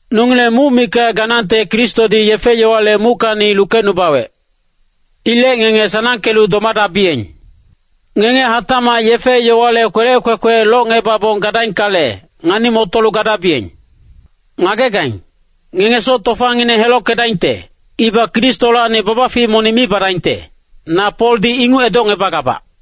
Nongileng muc mikac ganangte Kristodi yefe-yowale muckacni lukecnubawec. Ilec ngenge sanangkelu domadabiyeng. Ngenge hatacmac yefe-yowale kwelec kwekwe locngebabong gadaingkale, ngani-motolu gadabiyeng. Ngagegaing, ngenge soc tofangineng helockedaingte, ibac Kristolacni babafic monic mi badaingte, na Poldi inguc edocngebagabac.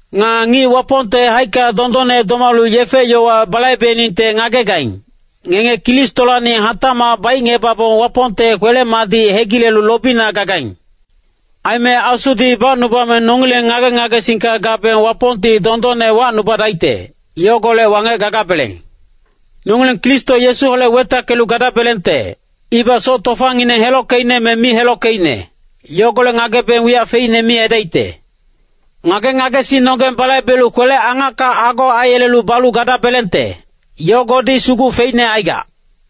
Nga ngic Wapongte haicka dondonne domalu yefe-yowa balaibeningte ngagegaing, ngenge Kristolacni hatacmac baicngebabong Wapongte kwele-madic hegilelu lobina gagaing. Aime Asudi bacnubame nongileng ngage-ngagesingka gabeng Wapongti dondonne wacnubadaicte, yogolec wangec gagabeleng. Nongileng Kristo Yesuholec wetackelu gadabelengte, ibac soc tofangineng helockeicne me mi helockeicne, yogolec ngagebeng wiyac feicne mi aidaicte. Ngage-ngagesingnonggeng balaibelu kwele-angacka ago aiyelelu balu gadabelengte, yogodi sugu feicne aigac.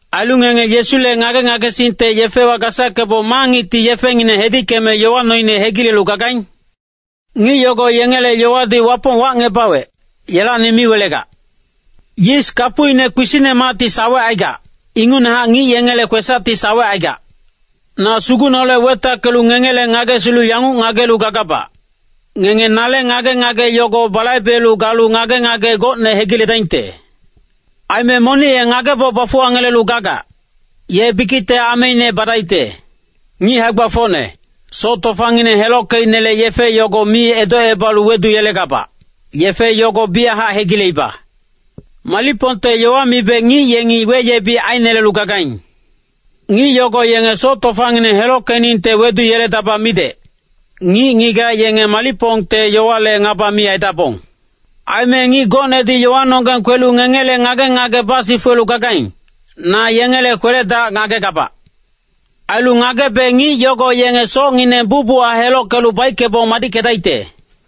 Ailu ngenge Yesule ngage-ngagesingte yefewa gasackebong ma ngicti yefengineng hedickeme yowa noine hegilelu gagaing? Ngic yogo yengele yowadi Wapong wacngebawec, yelacni mi welegac. Yis kapucine kpisicnemacti sawecaigac, ingucnehac ngic yengele kwesacti sawecaigac. Na Sugucneholec wetackelu ngengele ngagesilu yanguc ngagelu gagabac, ngenge nale ngage-ngage yogo balaibe galu ngage-ngage gocne hegiledaingte. Aime monic ye ngageboc bafuwangelelu gagac, ye bikicte ameine badaicte. Ngic hae-gbafocne, soc tofangineng helockeicnele yefe yogo mi edocebalu weduyelegabac, yefe yogo biyachac hegileiba. Malicpongte yowa mibe ngic yengi weyebic ainelelu gagaing. Ngic yogo yenge soc tofangineng helockeningte weduyeledaba midec, ngic-ngigac yenge malicpongte yowale ngaba mi aidabong. Aime ngic gocnedi yowanonggeng kwelu ngengele ngage-ngage basifuwelu gagaing, na yengele kwele-dac ngagegabac. Ailu ngagebe ngic yogo yenge socngineng bucbuchac helockelu baickebong madickedaicte.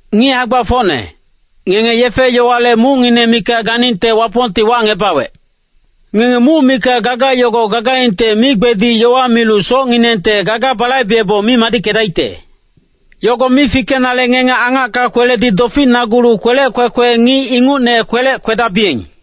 Ngic hae-gbafocne, ngenge yefe-yowale mucngineng mikac ganingte Wapongti wacngebawec. Ngenge muc mikac gaga yogo gagaingte migbedic yowa milu socnginengte gaga balaibebong mi madickedaicte. Yogo mi fikenale ngenge angacka kweledi doficnagulu kwelec kwekwe ngic ingucne kwelec kwedabiyeng.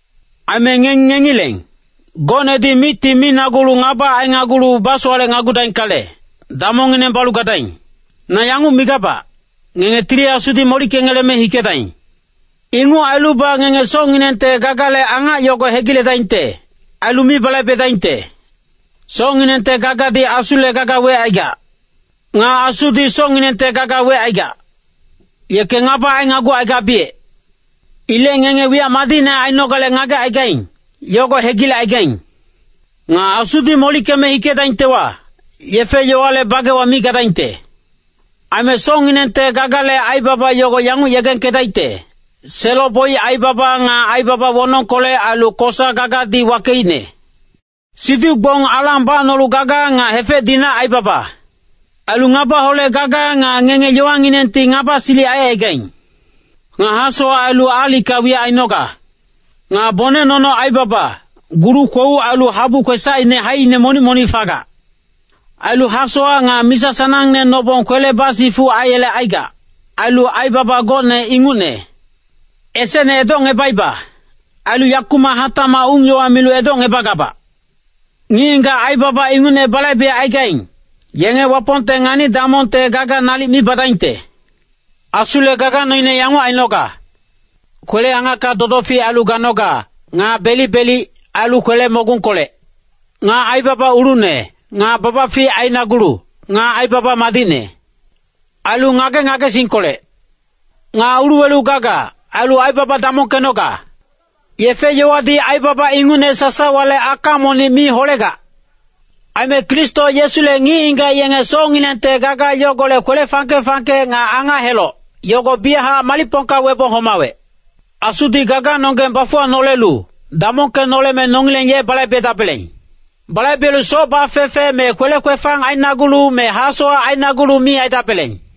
Aime ngenge ngengileng, gocnedi micti minagulu ngaba ainagulu basowalecnagudaingkale, damongngineng balu gadaing. Na yanguc migabac, ngenge Tili Asudi molickeme hikedaing. Inguc ailubac ngenge socnginengte gagale angac yogo hegiledaingte, ailu mi balaibedaingte. Socnginengte gagadi Asule gaga wecaigac. Nga Asudi socnginengte gaga wecaigac. Yeke ngaba ainagucaigabiyec. Ilec ngenge wiyac madicne ainogale ngagecaigaing, yogo hegilecaigaing. Nga Asudi molickeme hikedaingtewa, yefe-yowale bagewa mi gadaingte. Aime socnginengte gagale aibaba yogo yanguc yegengkedaicte, selo-boic aibaba nga aibaba wonongkolec ailu kosa gagadi wakeicne. Siduc-gbong alang bacnolu gaga nga hefec-dinac aibaba. Ailu ngabaholec gaga nga ngenge yowanginengti ngaba silic aicaigaing. Nga hasowac ailu aalicka wiyac ainoga. Nga bonec nono aibaba, gulu-kwouc ailu habu kwesacine haicine monic-monic fagac. Ailu hasowac nga misa sanangne nobong kwele basifuc aiyelecaigac, ailu aibaba gocne ingucne. Esecne edocngebaiba, ailu yakumac hatacmac ung-yowa milu edocngebagabac. Ngic-ngigac aibaba ingucne balaibecaigaing, yenge Wapongte ngani-damongte gaga nalic mi badaingte. Asule gaga noine yanguc ainoga. Kwele-angacka dodofic ailu ganoga, nga belic-belic, ailu kwele-mogungkolec. Nga aibaba ulucne, nga babafic ainagulu, nga aibaba madicne. Ailu ngage-ngagesingkolec, nga uluwelu gaga, ailu aibaba damongkenoga. Yefe-yowadi aibaba ingucne sasawale aka monic mi holegac. Aime Kristo Yesule ngic-ngigac yenge socnginengte gaga yogolec kwele fangke-fangke nga angac-heloc, yogo biyachac malicpongka webong homawec. Asudi gaganonggeng bafuwanolelu, damongkenoleme nongileng ye balaibedabeleng. Balaibelu soc bafefe me kwele kwefang ainagulu me hasowac ainagulu mi aidabeleng.